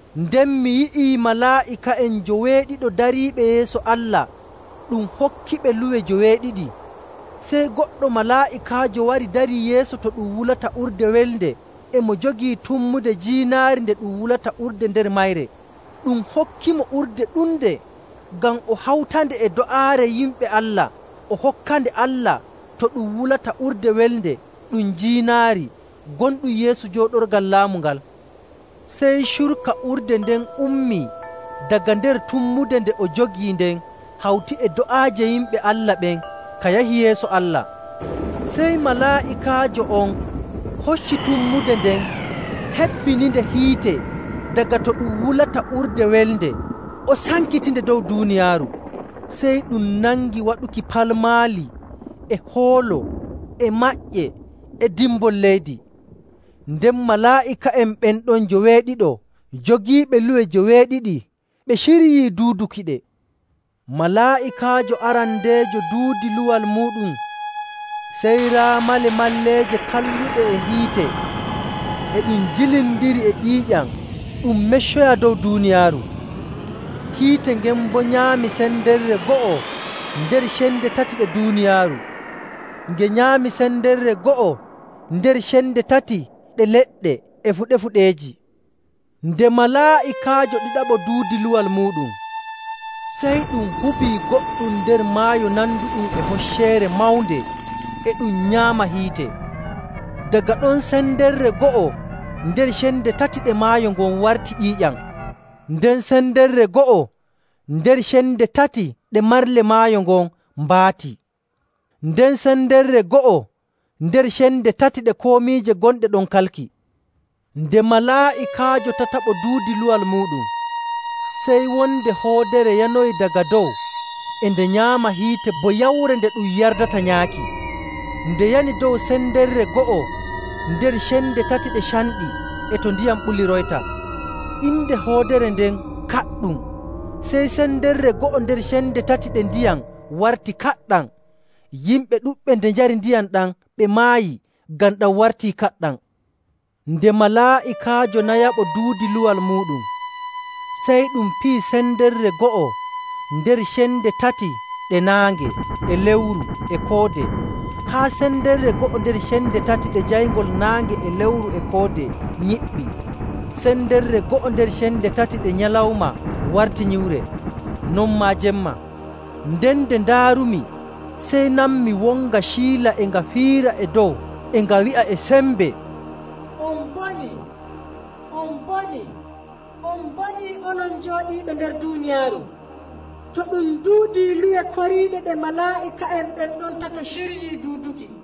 Nden mi yi'ii malaa'ika'en njoweeɗiɗo dariiɓe yeeso Allah ɗum hokkiɓe luwe joweeɗiɗi. Sey goɗɗo malaa'ikaajo wari darii yeeso to ɗum wulata urde welnde e mo jogii tummude jiinaari nde ɗum wulata urde nder mayre. Ɗum hokkimo urde ɗunde ngam o hawtande e do'aare yimɓe Allah o hokkande Allah to ɗum wulata urde welnde ɗum jiinaari gonɗum yeeso jooɗorgal laamu ngal. Sey curka urde nden ummii daga nder tummude nde o jogii nden hawti e do'aaje yimɓe Allah ɓen ka yahi yeeso Allah. Sey malaa'ikaajo on hocci tummude nden hebbininde hiite daga to ɗum wulata urde welnde, o sankitinge dow duuniyaaru. Sey ɗum nangi waɗuki palmaali, e hoolo, e maƴƴe, e dimbol leydi. Nden malaa'ika'en ɓen ɗon njoweeɗiɗo jogiiɓe luwe joweeɗiɗi ɓe ciryii duudukiɗe. Malaa'ikaajo arandeejo duudi luwal muuɗum sey raa malemalleeje kalluɗe e hiite e ɗum jillindirii e ƴiiƴam ɗum meccoyaa dow duuniyaaru. Hiite ngen boo nyaami sendere go'o nder cende tati ɗe duuniyaaru, nge nyaami sendere go'o nder cende tati ɗe leɗɗe e fuɗe fuɗeeji. Nde malaa'ikaajo ɗiɗaɓo duudi luwal muuɗum, sey ɗum hubii goɗɗum nder maayo nanduɗum e hocceere mawnde e ɗum nyaama hiite. Daga ɗon sendere go'o nder cende tati ɗe maayo ngon warti ƴiiƴam. Nden sendere go'o nder cende tati ɗe marle maayo ngon mbaati, nden sendere go'o nder cende tati ɗe komiije gonɗe ɗon kalki. Nde malaa'ikaajo tataɓo duudi luwal muuɗum, sey wonde hoodere yanoyi daga dow e nde nyaama hiite bo yawre nde ɗum yardata nyaaki. Nde yani dow sendere go'o nder cende tati ɗe canɗi e to ndiyam ɓuliroyta. Inde hoodere nden “Kaɗɗum.” Sey sendere go'o nder cende tati ɗe ndiyam warti kaɗɗam. Yimɓe ɗuɗɓe nde njari ndiyam ɗam ɓe maayi ngam ɗam wartii kaɗɗam. Nde malaa'ikaajo nayaɓo duudi luwal muuɗum, sey ɗum piyi sendere go'o nder cende tati ɗe naange e lewru e koode, haa sendere go'o nder cende tati ɗe jayngol naange e lewru e koode nyiɓɓi. Sendere go'o nder cende tati nde nyalawma warti nyiwre; non maa jemma. Nden nde ndaarumi, sey nanmi wonga ciila e nga fiira e dow e nga wi'a e sembe, “On mbonii! On mbonii! On mbonii onon jooɗiiɓe nder duuniyaaru, to ɗum duudii luwe koriiɗe ɗe malaa'ika'en ɓen ɗon tato ciryii duuduki!”